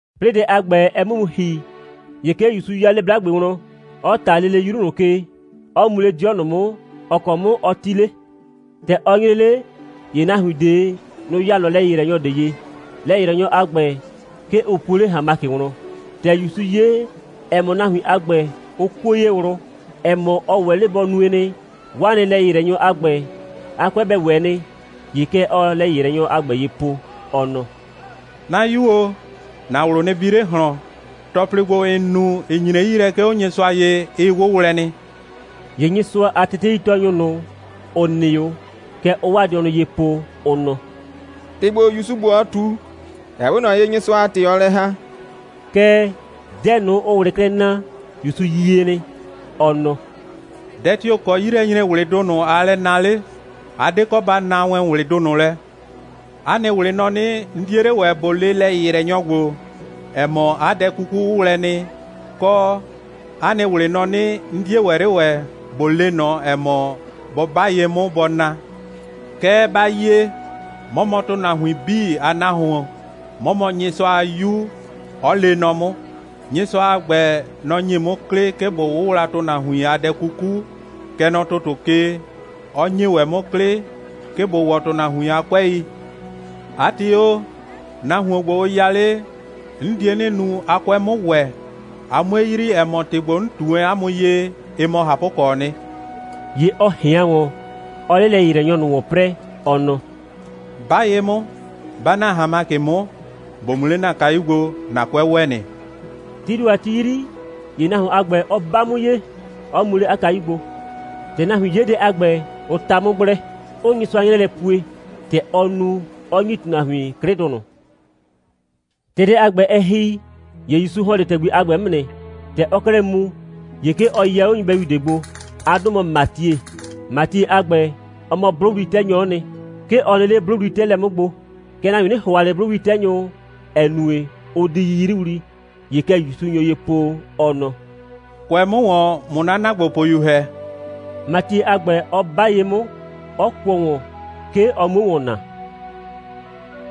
'Plɩɩ dɛ a ‑gbɛ, ɛ 'mʋ mu ‑hi, ‑ye 'ke ‑Yusu 'ya 'le 'blagbe wlɔn, 'ɔ ꞊ta lele 'yru ꞊nʋ ke, 'ɔ mu 'le 'dɩɔ ꞊nɔ 'mʋ, ‑ɔ kɔ 'mʋ ɔ 'ti 'le. ‑Tɛ ɔ nyre 'le, ‑ye nahuin ꞊de, nʋ‑ ya ꞊nɔ lɛ‑yɩyrɛnyɔ ꞊de ye. Lɛ‑yɩyrɛnyɔ a ‑gbɛ, 'ke ʋ puo 'le ‑hanmakɩ wlɔn. ‑Tɛ ‑Yusu 'ye, ‑ɛ mɔ, nahuin a ‑gbɛ, ʋ kuo ye ꞊wlʋ, ‑ɛ mɔ, ɔ ‑wɛ 'le bɔ nue nɩ, 'waa nɩ lɛ‑yɩyrɛnyɔ a ‑gbɛ, 'a 'kʋɛ bɛ ‑wɛ nɩ, ‑ye kɛ ɔɔ lɛ‑yɩyrɛnyɔ a ‑gbɛ ye po, ɔ nɔ: «'Na 'yu o, ‑na ꞊wlʋ nɩ bi 'le ꞊hlɔn, ‑tɔplɩ ‑gbo, ‑n nu, ‑ɩ nyre 'yi lɛ, 'ke 'o Nyɩsʋa ye, ɩ 'wʋwlɛ nɩ.» ‑Ye Nyɩsʋa a teteitɔɔnyʋ ꞊nʋ, ‑ʋ nɩ 'o, kɛ ʋʋ 'waa dɩɔnʋ ye po, ʋ nɔ: «‑Tɩ ‑gbo, ‑Yusu ‑gbo, ɔɔ ꞊tu, ɛ 'we ꞊nɔ ye, Nyɩsʋa a ‑tɩ ɔɔ lɛ ‑haa.» Kɛɛ, dɛ ꞊nʋ, ʋʋ ꞊wlɩ klɛ naa, ‑Yusu yie nɩ. Ɔ nɔ: «Dɛ tio‑ kɔ 'yilɛnyre꞊wlɩdʋ ꞊nʋ aa lɛ naa 'le? A 'de kɔ ba naa wɛn ꞊wlɩdʋ ꞊nʋ lɛ. 'A nɩ ꞊wlɩ nɔ 'nɩ, 'n 'die 'le ‑wɛ ꞊bo le lɛ‑yɩyrɛnyɔ ‑gbo, ‑ɛ mɔ, 'a dɛ 'kuku 'wʋwlɛ nɩ, kɔ, 'a nɩ ꞊wlɩ nɔ 'nɩ, 'n 'die ‑wɛ 'le ‑wɛ ꞊bo le ꞊nɔ, ‑ɛ mɔ, bɔ 'ba ye 'mʋ, bɔ na. Kɛɛ, ba yie, 'mɔ mɔ ‑tʋnahuin 'bii a Nahuon, 'mɔ mɔ Nyɩsʋa a 'Yu, 'ɔ lee nɔ 'mʋ. Nyɩsʋa a ‑gbɛ, nɔ‑ ‑nye 'mʋ 'klɩ, 'ke ꞊bo 'wʋwla ‑tʋnahuin a dɛ 'kuku, kɛ nɔ ‑tʋtʋ ke, 'ɔ ‑nye ‑wɛ 'mʋ 'klɩ, 'ke ꞊bo ‑wɔ ‑tʋnahuin a 'kʋɛi. 'A ‑tɩ o, nahuon ‑gbo, ʋ ya 'le, 'n die 'nɩ nu, 'a 'kʋɛ 'mʋ ‑wɛ, a 'mue yrii, ‑ɛ mɔ, ‑tɩ ‑gbo, 'n ꞊tu wɛn 'a mʋ ye, ɩ mɔ ꞊hapʋkɔɔ nɩ.» ‑Ye ɔ ꞊hɩan ‑wɔn, 'ɔɔ 'le lɛ‑yɩyrɛnyɔ ꞊nʋ ‑wɔn 'prɛɛ, ɔ nɔ: «'Ba ye 'mʋ, 'ba ‑na ‑hanmakɩ 'mʋ, ‑bo mu 'le ‑na kayu gbo, ‑na 'kʋɛ ‑wɛ nɩ.» Tii ‑do a ti 'yri, ‑ye nahuon a ‑gbɛ, ɔ 'ba 'mʋ ye, 'ɔ mu 'le 'a kayu gbo. ‑Tɛ nahuin 'ye dɛ a ‑gbɛ, ʋ 'ta 'mʋ gblɛ, 'ʋʋ Nyɩsʋa 'nyrɛɛ lɛ pue, ‑tɛ ɔ nu, 'ɔ ‑nyi ‑tʋnahuin 'klɩdʋ ꞊nʋ. ‑Tɛ dɛ a ‑gbɛ, ɛ ‑hi, ‑ye ‑Yusu ‑hɔn 'le ‑tɛgbi a ‑gbɛ 'mʋ nɩ. ‑Tɛ ɔɔ 'klɛɛ mu, ‑ye 'ke ɔ yɛ 'o nyɩbɛyu ꞊de gbo. 'A 'dʋ mɔ Matie. Matie a ‑gbɛ, ɔ mɔ 'blʋwli'tɛnyɔ'ɔ nɩ. 'Ke ɔ nɩ 'le 'blʋwli'tɛɛlɛ 'mʋ gbo. (Kɛɛ, nahuin 'nɩ ‑hʋa ꞊le 'blʋwli'tɛnyʋ, ‑ɛ nue, ʋʋ di 'yiyriwli.) ‑Ye kɛ ‑Yusu nyo ye po, ɔ nɔ: «Kʋɛ 'mʋ ‑wɔn, ꞊mʋ 'na ‑naagbopʋyu ‑hɛ!» Matie a ‑gbɛ 'ɔ 'ba ye 'mʋ, 'ɔ kʋɔ ‑wɔn, 'ke ɔ 'muo ‑wɔn naa.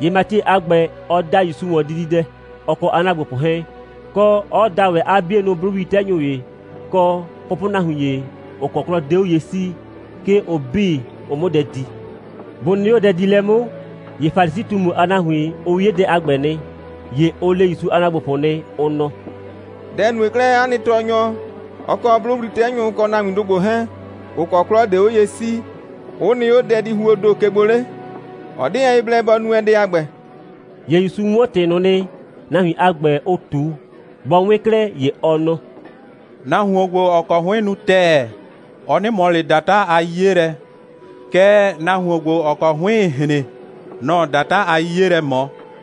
‑Ye Matie a ‑gbɛ, ɔ da ‑Yusu ‑wɔn dididɛ, ɔ kɔ 'a ‑naagbopʋ 'hɛɛn, kɔ, 'ɔ da ‑wɛ 'a 'bienʋ 'blʋwli'tɛnyʋ ‑ye, kɔ pʋpʋnahuin ‑ye, ‑ʋ kɔ 'klɔ 'de 'o ye 'sii, 'ke ʋ 'bii, ʋ 'mʋ dɛ di. Bʋ nɩ 'o dɛdiilɛ 'mʋ, ‑ye Falisi꞊tumu a nahuin, ʋ 'ye dɛ a ‑gbɛ nɩ. ‑Ye ʋ le ‑Yusu a ‑naagbopʋ nɩ, ʋ nɔ: «Dɛ‑ nue 'klɛɛ, 'a nɩ tɔɔnyɔ, ɔ kɔ 'blʋwli'tɛnyʋ kɔ nahuindʋ ‑gbo 'hɛɛn, ‑ʋ kɔ 'klɔ 'de 'o ye 'sii, 'ʋ nɩ 'o dɛdihuoo ‑do ke gbo 'le? Ɔ 'de wɛn ye blɛ bɔ nu wɛn dɛ a ‑gbɛ.» ‑Ye ‑Yusu 'wɔn ‑tɩ ꞊nʋ nɩ, nahuin a ‑gbɛ, ʋ ꞊tu. Bɔ 'wɩn 'klɛɛ, ‑ye ɔ nɔ: «Nahuon ‑gbo, ‑ɔ kɔ 'hʋɩn nu ‑tɛɛ, ɔ 'nɩ ꞊mɔ ꞊le ‑data a 'yiye lɛ, kɛɛ, nahuon ‑gbo, ‑ɔ kɔ 'hʋɩɩn‑ hren, nɔ‑ɔ ‑data a 'yiye lɛ ꞊mɔ.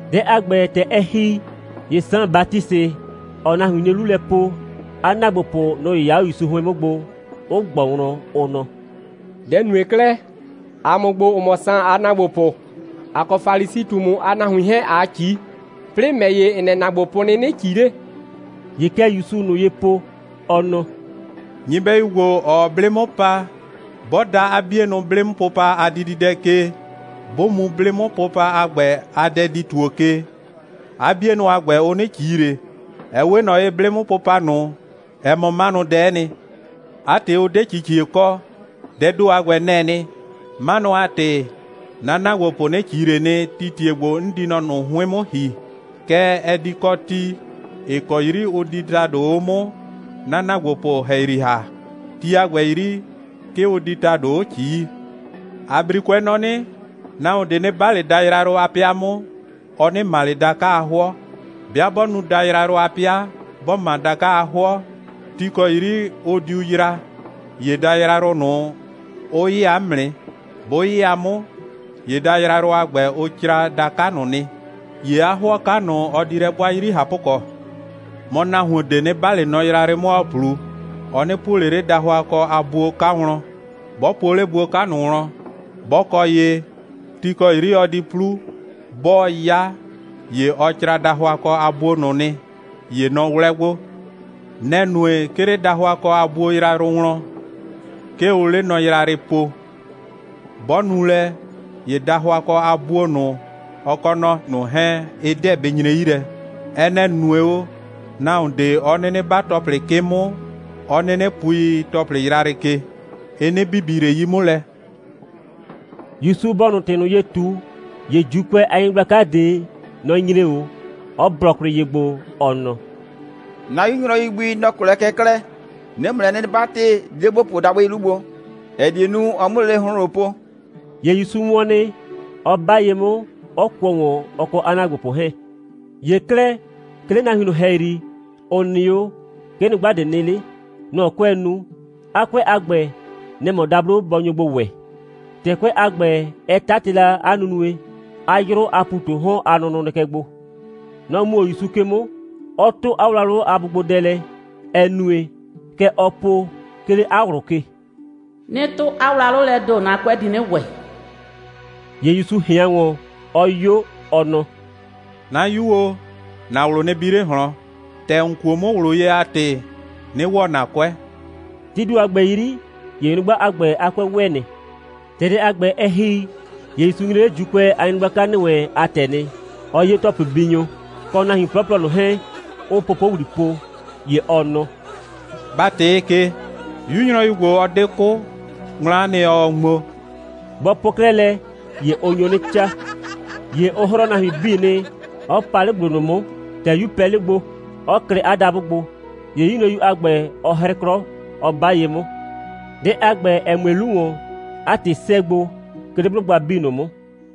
Dɛ a ‑gbɛ, ‑tɛ ɛ ‑hi, ‑ye Saan Batisɩ, ‑ɔɔ nahuin 'nie 'lu lɛ po, 'a ‑naagbopʋ, nʋ‑ 'yɩya 'o ‑Yusu 'hʋɩn 'mʋ gbo, 'ʋ ꞊gbɔ wlɔn, ʋ nɔ: «Dɛ‑ nue 'klɛɛ, ‑a mʋ ‑gbo, ‑ʋ mɔ Saan a ‑naagbopʋ, ‑a kɔ Falisi꞊tumu a nahuin 'hɛɛn ꞊aa ꞊ci, 'plɩɩ ‑mɛ ‑ye, ‑n nɛ ‑naagbopʋ 'ʋ 'nɩnɩ ꞊ci 'le?» ‑Ye kɛ ‑Yusuu ꞊nʋ ye po, ɔ nɔ: «Nyɩbɛyu ‑gbo, ‑ɔɔ 'blɩ 'mʋ pa, 'bɔ da 'a 'bienʋ 'blɩ'mʋpʋpa a dididɛ ke, 'bʋ mu 'blɩ'mʋpʋpa a ‑gbɛ a dɛdi‑tuo ke, 'a 'bienʋ a ‑gbɛ, ʋ 'nɩ ꞊ci ꞊le. Ɛ 'we ꞊nɔ ye, 'blɩ'mʋpʋpa ꞊nʋ, ɛ mɔ 'manʋdɛ'ɛ nɩ. 'A ‑tɩ, ʋ 'de ꞊cicie kɔ. Dɛɛ ‑do a ‑gbɛ, nɛ‑ɛ nɩ. 'Manʋ a ‑tɩ 'na ‑naagbopʋ 'nɩ ꞊ci ꞊le nɩ, tii ‑tie ‑gbo 'n di mɔ ꞊nʋ 'hʋɩn 'mʋ ‑hi. Kɛɛ, ɛ di kɔ ti, ‑ɩ kɔ 'yri ʋ di ‑tado 'o 'mʋ 'na ‑naagbopʋ ‑hɛyri ‑ha. Ti a ‑gbɛ 'yri, 'ke ʋ di ‑tado 'o ꞊cii. ‑A 'brikʋɛ nɔ 'nɩ: Nahuon ꞊de 'nɩ 'ba ꞊le dayrayrʋ a 'pɩa 'mʋ, ɔ 'nɩ ‑ma ꞊le da'ka a 'hʋɔ. 'Bɩa 'bɔ nu dayrayrʋ a 'pɩa, 'bɔ ‑ma da'ka a 'hʋɔ, ti ‑kɔ 'yri ɔ diu yra, ‑ye dayrayrʋ ꞊nʋ, ʋ 'yɩya 'mʋ nɩ. 'Bʋ 'yɩya 'mʋ, ‑ye dayrayrʋ a ‑gbɛ, ʋ cra da'ka ꞊nʋ nɩ. ‑Ye 'a 'hʋɔ 'ka ꞊nʋ, ɔ di lɛ 'bʋa 'yri ꞊hapʋkɔ. Mɔ, nahuon ꞊de 'nɩ 'ba ꞊le nɔ yrayrɩ 'mʋ, ‑ɔɔ 'plu, ɔ 'nɩ puo ꞊le 'le dahʋakɔ a buo 'ka wlɔn. 'Bɔ puo 'le buo 'ka ꞊nʋ wlɔn, 'bɔ kɔ ye, ti ‑kɔ ti 'yri ɔ di 'plu, 'bɔɔ 'ya, ‑ye ɔ cra dahʋakɔ a buo ꞊nʋ nɩ. ‑Ye nɔ 'wlɛ gbo. Nɛ‑ nue, 'ke 'le dahʋakɔ a buo yrayrʋ wlɔn, 'ke ʋʋ 'le nɔ yrayrɩ po. 'Bɔ nu lɛ, ‑ye dahʋakɔ a buo ꞊nʋ, ɔ kɔ nɔ ꞊nʋ 'hɛɛn, ɩ 'deɛ bɩ nyre 'yi lɛ. (Ɛ nɛ‑ nue o, nahuon ꞊de 'ɔ 'nɩnɩ 'ba ‑tɔplɩ 'kɩ 'mʋ, 'ɔ 'nɩnɩ pui ‑tɔplɩ yrayrɩ ke. Ɩ 'nɩ bibi ꞊le 'yi 'mʋ lɛ.)» ‑Yusu bɔɔ ꞊nʋ ‑tɩ ꞊nʋ ye ꞊tu, ‑ye ‑Juukʋɛ a nyɩgblaka ꞊de, nɔ‑ nyre 'o, 'ɔ blɔ kwlɩ ye gbo, ɔ nɔ: «'Na 'yu nyrɔyu gbi, nɔ‑ 'kʋ lɛ kɛ 'klɛɛ. 'Nɩɩ ‑mʋ lɛ 'nɩ 'batɩ, di 'le ‑bo puo dabʋɩ 'lu gbo, ‑ɛ die nu, ɔ 'mʋ lele ‑hʋnhlʋn po.» ‑Ye ‑Yusu wɔn nɩ, 'ɔ 'ba ye 'mʋ, 'ɔ kʋɔ ‑wɔn, ɔ kɔ 'a ‑naagbopʋ 'hɛɛn. ‑Ye 'klɛɛ, 'ke 'le nahuin ꞊nʋ ‑hɛyri, ‑ʋ nɩ 'o, 'ke nyrʋgba ꞊de nɩ 'le. Nɔ‑ 'kʋɛɛ nu. 'A 'kʋɛ a ‑gbɛ, nɛ‑ mɔ dablo bɔ nyo gbo ‑wɛ. ‑Tɛ 'kʋɛ a ‑gbɛ, ɛ 'tatɩ la 'a nunue, 'a 'yrʋ a ‑pu ꞊tu 'o 'hɔn a nʋnʋ nɩ kɛ gbo. Nɔ‑ mu 'o ‑Yusu ke 'mʋ, 'ɔ 'tʋ 'a wlawlʋ a bʋgbodɛ lɛ, ‑ɛ nue, kɛ ɔɔ po, 'ke 'le 'a ꞊wlʋ ke: «'Nɩ 'tʋ 'a wlawlʋ lɛɛ ‑do, 'na 'kʋɛ di 'nɩ ‑wɛ.» ‑Ye ‑Yusu ꞊hɩan ‑wɔn, 'ɔ 'yo, ɔ nɔ: «'Na 'yu o, ‑na ꞊wlʋ nɩ bi 'le ꞊hlɔn. ‑Tɛ ‑n kuo 'mʋ ꞊wlʋ ye a ‑tɩ, 'nɩ ‑wɔ ‑na 'kʋɛ.» Tii ‑do a ‑gbɛ 'yri, ‑ye nyrʋgba a ‑gbɛ a 'kʋɛ ‑wɛ nɩ. ‑Tɛ dɛ a ‑gbɛ, ɛ ‑hi, ‑ye ‑Yusu nyre 'le ‑Juukʋɛ a nyɩgblaka ‑nɩ wɛn a ‑tɛ nɩ, 'ɔ 'ye ‑tɔplɩbinyʋ kɔ nahuin 'plɔplɔ ꞊nʋ 'hɛɛn, 'ʋʋ popowli po, ‑ye ɔ nɔ: «Ba ꞊tɩɩ ke! 'Yu nyrɔyu ‑gbo, ɔ 'de 'kʋ. Ŋmla'a nɩ, ɔɔ ŋmo.» Bɔ po 'klɛɛ lɛ, ‑ye ʋ nyo 'nɩ 'caa. ‑Ye ʋ 'hrɔɔ nahuin 'bii nɩ, 'ɔ pa 'le ‑gblo ꞊nʋ 'mʋ, ‑tɛ 'yu pɛ 'le gbo, 'ɔ klɩ 'a dabʋ gbo. ‑Ye 'yu nyrɔyu a ‑gbɛ, ɔ 'hrɩ 'klɔ, 'ɔ 'ba ye 'mʋ. Dɛ a ‑gbɛ, ‑ɛ mue 'lu ‑wɔn, 'a ‑tɩ 'sɛɛ gbo, 'ke 'le 'blʋgba 'bii ꞊nʋ 'mʋ.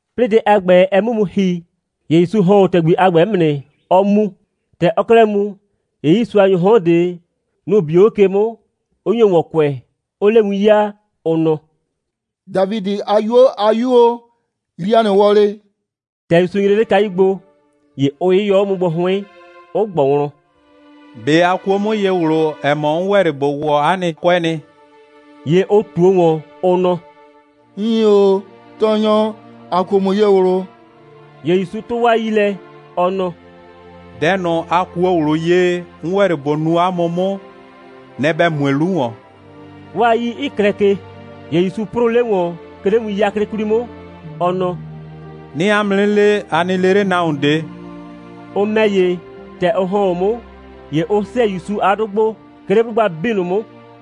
'Plɩɩ dɛ a ‑gbɛ, ɛ 'mʋ mu ‑hi, ‑ye ‑Yusu ‑hɔn 'o ‑tɛgbi a ‑gbɛ 'mʋ nɩ, 'ɔɔ mu. ‑Tɛ ɔɔ 'klɛɛ mu, ‑ye 'yiisuanyʋʋ 'hɔn ꞊de, nʋ‑ bio 'o ke 'mʋ, 'ʋ nyo ‑wɔn kʋɛ, 'ʋʋ 'le win 'yaa, ʋ nɔ: «Dafidɩ a 'yuo a 'Yu o, yrii ‑a nɩ wɔlɩ!» ‑Tɛ ‑Yusu nyre 'le kayu gbo, ‑ye ʋ 'yɩyɔ 'o 'mʋ gbo 'hʋɩn, 'ɔ ꞊gbʋ wlɔn: «꞊Be a kuo 'mʋ ye ꞊wlʋ, ‑ɛ mɔ, 'n ‑wɛ 'le ꞊bo ‑wɔ 'a nɩ 'kʋɛ nɩ?» ‑Ye ʋ ꞊tuo ‑wɔn, ʋ nɔ: «Iin ‑o, Tɔɔnyɔ, ‑a kuo ‑mʋ ye ꞊wlʋ.» ‑Ye ‑Yusu 'tʋ 'waa 'yii lɛ, ɔ nɔ: «Dɛ ꞊nʋ, a kuo ꞊wlʋ ye, 'n ‑wɛ 'le ꞊bo nu 'a mʋ 'mʋ, nɛ‑ ‑bɛ mue 'lu ‑wɔn,» 'waa 'yii 'ɩ klɛ ke. ‑Ye ‑Yusu 'prʋʋ 'le ‑wɔn, 'ke 'le win 'yaklɩ 'kwli 'mʋ, ɔ nɔ: «'Nɩɩ 'a mʋ 'nɩ le, a nɩ le 'le nahuon ꞊de!» Ʋ ‑mɛ ‑ye, ‑tɛ ʋ ‑hɔn 'o 'mʋ, ‑ye ʋ 'sɛɛ ‑Yusu a 'dʋ gbo, 'ke 'le 'blʋgba 'bii ꞊nʋ 'mʋ.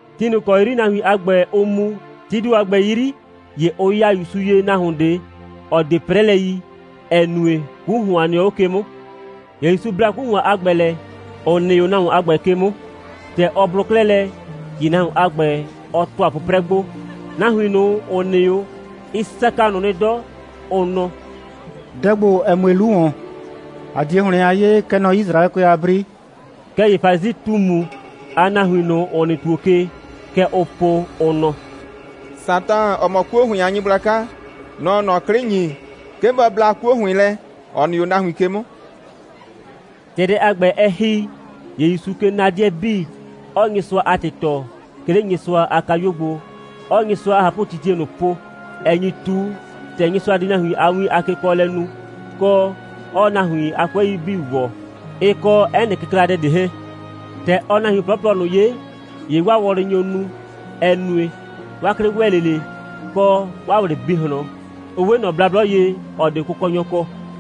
Ti ꞊nʋ ‑kɔ 'yri nahuin a ‑gbɛ, ʋʋ mu, tii ‑do a ‑gbɛ 'yri, ‑ye ʋ ya ‑Yusu ye nahuon ꞊de, ‑ɔ 'de 'prɛlɛ yi, ‑ɛ nue, 'ku ‑hʋan nɩɔ 'o ke 'mʋ. ‑Ye ‑Yusu bla 'ku ‑hʋan a ‑gbɛ lɛ, ‑ʋ nɩ 'o nahuon a ‑gbɛ ke 'mʋ. ‑Tɛ ɔ blʋ 'klɛɛ lɛ, ‑ye nahuon a ‑gbɛ, ɔ ‑tʋa 'pʋprɛ gbo. Nahuin ꞊nʋ, ‑ʋ nɩ 'o, ɩ saka ꞊nʋ nɩ 'dɔ, ʋ nɔ: «Dɛ ‑gbo, ‑ɛ mue 'lu ‑wɔn, ‑a 'die ‑hlɩn a 'yee, kɛ nɔ Yisraɛkʋɛ a 'bri.» Kɛɛ ‑ye Falisi꞊tumu a nahuin ꞊nʋ, ‑ʋ nɩ ‑tuo ke, kɛ ʋʋ po, ʋ nɔ: «Satan, ‑ɔ mɔ 'kuo ‑hʋɩn a nyɩgblaka, nɔ‑ɔ ꞊nɔ 'klɩ ‑nyi, 'ke bɔ bla 'kuo ‑hʋɩn lɛ, ‑ɔ nɩ 'o nahuin ke 'mʋ.» ‑Tɛ dɛ a ‑gbɛ, ɛ ‑hi, ‑ye ‑Yusuu ke na 'dɩɛ 'bii, 'ɔɔ Nyɩsʋa a ‑tɩ tɔɔ, 'ke 'le Nyɩsʋa a kayuo gbo, 'ɔɔ Nyɩsʋa a ꞊hapʋtitie ꞊nʋ po, ‑ɛ nyi ꞊tu, ‑tɛ Nyɩsʋa di nahuin a win a kekɔɔlɛ nu, kɔ, 'ɔɔ nahuin a 'kʋɛi 'bii ‑wɔ, ɩ kɔ 'ɛ nɩ kɩkladɛ ꞊de 'hɛɛn. ‑Tɛ ɔɔ nahuin 'plɔplɔ ꞊nʋ 'ye, ‑ye 'waa wɔlɩ nyo nu, ‑ɛ nue, 'waa 'klɩ ‑wɛ 'le ꞊le, kɔ 'waa ꞊wlɩ 'ɩ bi ꞊hlɔn. Ʋ 'we ꞊nɔ blablɔ ye, ‑ɔ 'de kʋkɔnyɔ kɔ.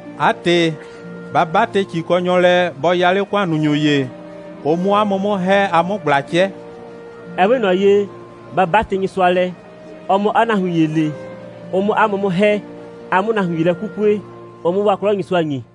'A ‑tɩ, ba 'batɩ ‑cikɔnyɔ lɛ, bɔ le 'a ‑kʋannunyʋ ‑ye, ʋ 'mʋ 'a mʋ 'mʋ ‑hɛ, a 'mʋ ꞊gbla 'cɛ.» (Ɛ 'we ꞊nɔ ye, ba 'batɩ Nyɩsʋa lɛ, ɔ 'mʋ 'a nahuin ‑ye le, ʋ 'mʋ 'a mʋ 'mʋ ‑hɛ, a 'mʋ nahuin ‑ye lɛ 'kukue, ʋ 'mʋ 'waa 'klɔ Nyɩsʋa ‑nyi.)